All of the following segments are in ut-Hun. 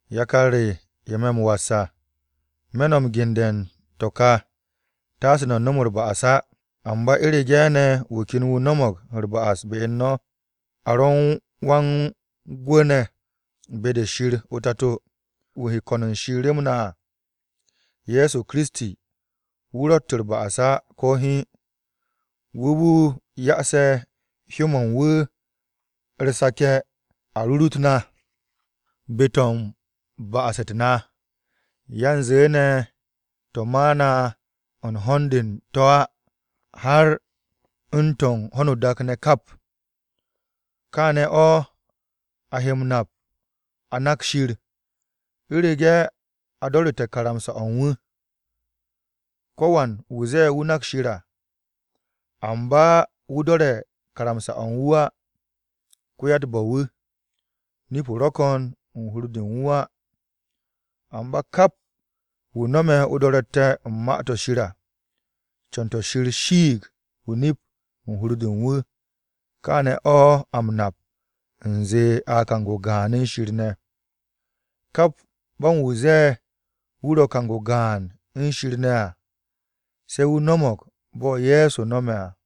Yakar re, ye̱ me̱ m-was à, me̱ no̱ m-gende̱ u̱n to̱ ka, taase no̱ nom u̱r-ba'as á. Amba u̱rege̱ ne̱ wu̱ ken no̱mo̱g u̱r-ba'as be u̱n no̱, a ro̱ u̱n Wa-u̱t-Orom ne̱ be-de Shir o-Tato, wu̱ he ko̱n u̱n Shir rem na à, Ye̱so Kiristi, wu̱ ro̱tt u̱r-ba'as á, ko̱ hiin. Wu̱ wu̱ ya'ase̱ hyó-mo̱ u̱n wu̱ u̱r-sake̱ a rurut na be-to̱ u̱n ba'as-u̱t na. Yanze ne̱ to̱ ma na u̱n ho̱n-de u̱n to̱ á, har u̱n to̱ u̱n ho̱no o-dak ne̱ kap. Kaane̱ o̱ a he m-nap a nak Shir, u̱rege̱ a do̱ru̱te̱ karamsa-o̱ u̱n wu̱. Ko̱wan wu̱ ze̱e̱ wu̱ nak Shir, amba wu̱ do̱re̱ karamsa-o̱ u̱n wu̱ á, ko-ya-u̱t-bo̱-wu̱. Nip-o ro̱ ko̱n u̱n hur-de u̱n u̱n wu̱ á. Amba kap wu̱ no̱me̱ o-do̱ro̱tte̱ u̱n Ma-to̱ Shir à, co̱n-to̱ Shir shiig o-nip u̱n hur-de u̱n wu̱. Kaane̱ o̱ a m-nap u̱nze a kang-o gaan u̱n Shir ne̱. Kap bo̱n wu̱ ze̱e̱ wu̱ ro̱ kang-o gaan u̱n Shir ne̱ à, se̱ wu̱ no̱mo̱g bo̱ Ye̱so no̱me̱ à.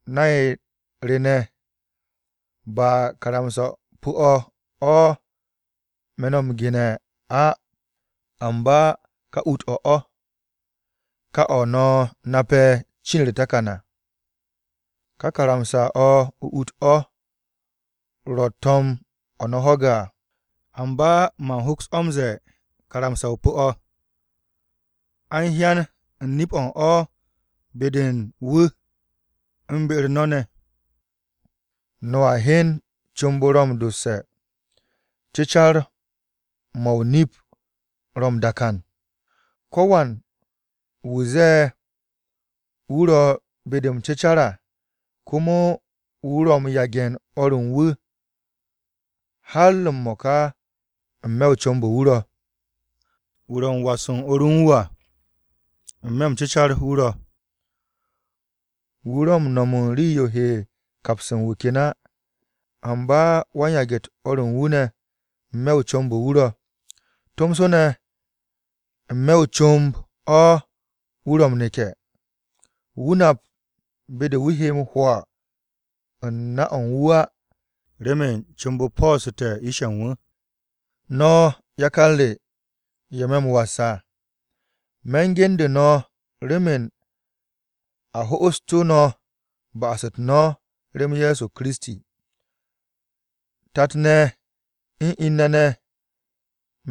Nay re ne̱, ba karamsa-o pu̱-o̱ o̱ me̱ no̱ m-gene̱ á amba ká ut-o̱ o̱, ká o̱ no̱ nape̱ cin u̱r-takan à. Kà karamsa-o ut-o̱ o̱ ro̱ to̱m-o̱ no̱ ho̱ge̱ à. Amba man hoks o̱ m-ze̱e̱ karamsa-o pu̱-o̱, a u̱n hyan u̱n nip-o̱ u̱n o̱ be-de u̱n wu̱ u̱n be-u̱r no̱ ne̱. No̱a hyen comb-o ro̱ m-dosse̱, cecar-mo̱ o-nip ro̱ m-dakan. Ko̱wan wu̱ zee wu̱ ro̱ be-de m-cecar à, komo wu̱ ro̱ m-yage̱ u̱n o̱r u̱n wu̱, har m-mo̱ka à n-me̱ o-comb wu̱ ro̱. Wu̱ ro̱ m-was u̱n o̱r u̱n wu̱ à, n-me̱ m-cecar wu̱ ro̱. Wu̱ ro̱ m-no̱m rii-yo he kaps u̱n wu̱ ken á. Amba wan-yage̱-u̱t o̱r u̱n wu̱ ne̱, n-me̱ o-comb o̱ wu̱ ro̱. Tomso ne̱ n-me̱ o-comb o̱ wu̱ ro̱ m-neke̱. Wu̱ nap be-de wu̱ he m-hwo̱ u̱n na-o̱ u̱n wu̱ á, remen comb-o po̱o̱ste̱ yish-ye̱ u̱n wu̱. No̱ yakar re, ye̱ me̱ m-was à, me̱ u̱n genbu̱ no̱ remen Shir ho'osu̱tu̱ no̱ ba'as-u̱t no̱ rem Ye̱so Kiristi. Tat-ne̱ u̱n in-ne̱ ne̱,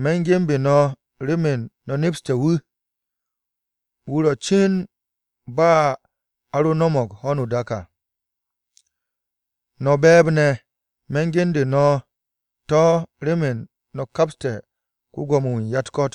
me̱ u̱n ge̱nbe̱ no̱ remen no̱ nepste̱ wu̱, wu̱ ro̱ cin ba a ro no̱mo̱g ho̱no o-dak à. No̱ be̱e̱b-ye̱, me̱ u̱n genbu̱ no̱ to̱ remen no̱ kapste̱ ko-Gwo̱mo-wu̱ u̱n ya-u̱t-ko̱t.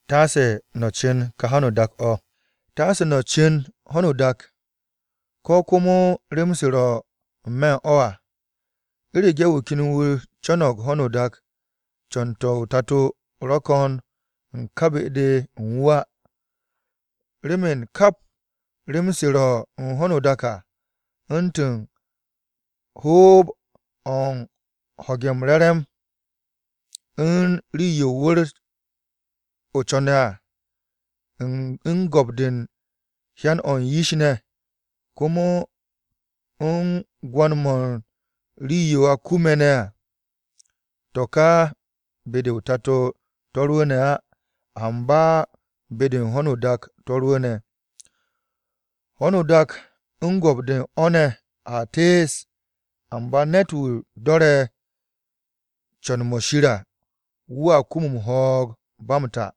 Taase no̱ cu̱n ho̱no o-dak, ko̱ komo rem-se ro̱ n-me̱ u̱n o̱ á. U̱rege̱ wu̱ ken wu̱ co̱no̱g ho̱no o-dak, co̱n-to̱ o-Tato ro̱ ko̱n o̱ ká be-de u̱n wu̱ á Remen kap rem-se ro̱ u̱n ho̱no o-dak à, u̱ntu̱n hoob-o̱ u̱n ho̱ge̱ u̱n re̱re̱m-mo̱ u̱n rii-yo wu̱r-o co̱ne̱ à, u̱n go̱p-de u̱n hyan-o̱ u̱n yish ne̱, komo u̱n gwo̱n-mo̱ u̱n rii-yo a kume̱ ne̱ à. To̱ kà ba be-de o-Tato to̱ rwu̱u̱ne̱ á, amba be-de u̱n ho̱no o-dak to̱ rwu̱u̱ne̱. Ho̱no o-dak u̱n go̱p-de u̱n o̱ ne̱ a tees, amba ne̱t-wu̱ do̱re̱ co̱n-mo̱ Shir à wu̱a kum ho̱o̱g-o̱ ba m-ta.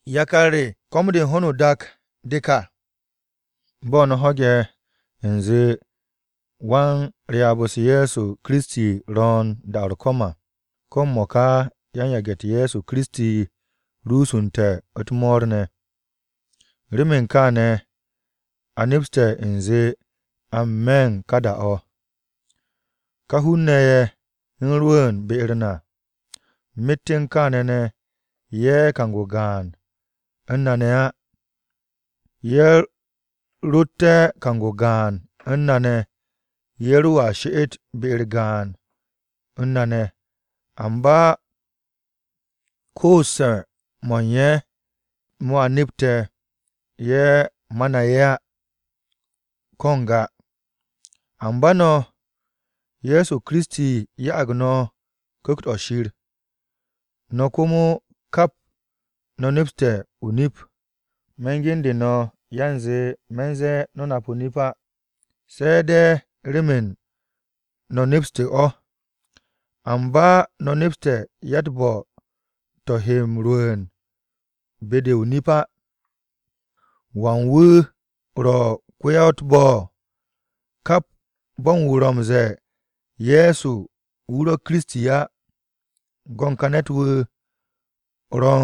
Yakar re, ko̱m-de ho̱no o-dak de ka. Bo̱ no̱ ho̱ge̱ u̱nze wan-Ryaab-u̱s Ye̱so Kiristi ro̱o̱n da-o̱ u̱r-ko̱m à, ko̱ m-mo̱ka yan-yage̱-u̱t Ye̱so Kiristi rusunte̱ u̱t-mo̱o̱r ne̱. Remen kaane̱ a nepste̱ u̱nze a n-me̱ u̱n ka da-o̱. Ká hun-ne̱ ye̱ u̱n rwu̱u̱n be-u̱r na, myet u̱n kaane̱ ne̱ ye̱ kang-o gaan u̱n na ne̱ á. Ye̱ rotte̱ kang-o gaan u̱n na ne̱, ye̱ ro̱a she'et be-u̱r gaan u̱n na ne̱. Amba koos-mo̱ u̱n ye̱, mo̱ a nepte̱ ye̱ ma na ye̱ á, ko̱ n-ga. Amba no̱, Ye̱so Kiristi ya'ag no̱ Ku̱kt-o̱ Shir. No̱ komo, kap, no̱ nepste̱ o-nip. Me̱ m-gende̱ no̱, yanze me̱ u̱nze no̱ nap o-nip á, se̱ de̱ remen no̱ nepste̱ o̱. Amba no̱ nepste̱ yatt bo̱-to̱ he m-rwu̱u̱n be-de o-nip á. ¿Wan wu̱ ro̱ ko-ya-u̱t-bo̱? Kap bo̱n wu̱ ro̱ m-ze̱e̱ Ye̱so wu̱ ro̱ Kiristi á. Go̱n ka ne̱t-wu̱ ro̱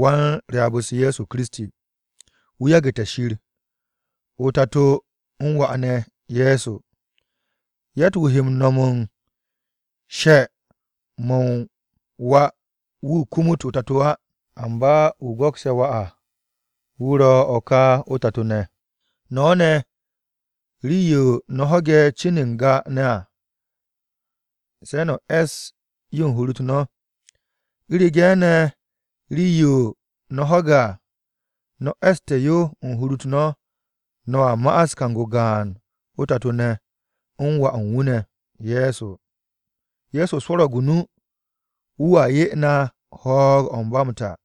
wan-Ryaab-u̱s Ye̱so Kiristi, wu̱ yagu̱te̱ Shir, o-Tato u̱n Wà ne̱ Ye̱so. Yatt-wu̱ he no̱m u̱n she-mo̱ u̱n Wà, wu̱ kumut o-Tato á, amba wu̱ go̱kse̱ Wà à, wu̱ ro̱ ká o-Tato ne̱. No̱ ne̱, rii-yo no̱ ho̱ge̱ cin n-ga ne̱ à, se̱ no̱ e̱ss yo u̱n hur-u̱t no̱. U̱rege̱ ne̱ rii-yo no̱ ho̱ge̱ à, no̱ e̱sste̱ yo u̱n hur-u̱t no̱, no̱a ma'as kang-o gaan o-Tato ne̱ u̱n Wà u̱n wu̱ ne̱, Ye̱so. Ye̱so swo̱ro̱g o-nu, wu̱a 'ye na ho̱o̱g-o̱ u̱n ba m-ta.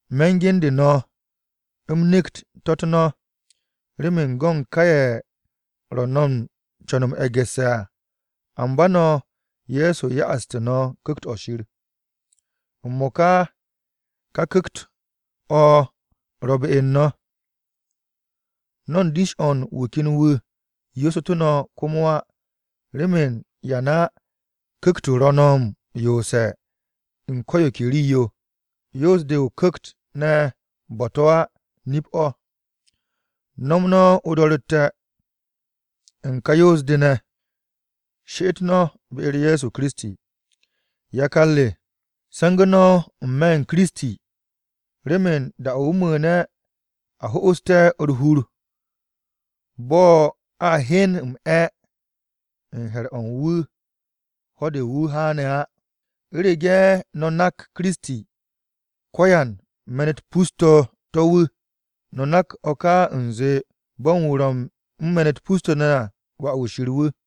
Me̱ m-gende̱ no̱ u̱m nekt to̱-u̱t no̱ remen go̱ u̱n ká ye̱ ro̱ no̱ u̱n co̱n m-e̱gu̱sse̱ à. Amba no̱, Ye̱so ya'aste̱ no̱ Ku̱kt-o Shir. M-mo̱ka ka Ku̱kt-o̱ ro̱ be u̱n no̱. No̱ u̱n dish-o̱ wu̱ ken wu̱ yoosu̱tu̱ no̱ komo á. Remen yan á, Ku̱kt-o̱ ro̱ no̱ m-yoose̱ u̱n ko̱ yo ke rii-yo. Yoos-de u̱n o-Ku̱kt ne̱ bo̱-to̱ á, nip-o̱. No̱m no̱ o-do̱ro̱tte̱ u̱n ka yoos-de ne̱, she'et no̱ be-u̱r Ye̱so Kiristi. Yakar re, se̱ngu̱ no̱ n-me̱ u̱n Kiristi, remen da-o̱ wu̱ mu̱u̱ne̱ a ho'oste̱ u̱r-hur, bo̱ a hyen m-'e̱ u̱n he̱r-o̱ u̱n wu̱ ho̱-de wu̱ haan á. U̱rege̱ no̱ nak Kiristi, ko-yan-me̱n-u̱t pus-to̱ wu̱, no̱ nak o̱ ka u̱nze bo̱n wu̱ ro̱ u̱n me̱n-u̱t pus-to̱ ne̱ à, wà-wu̱ Shir wu̱.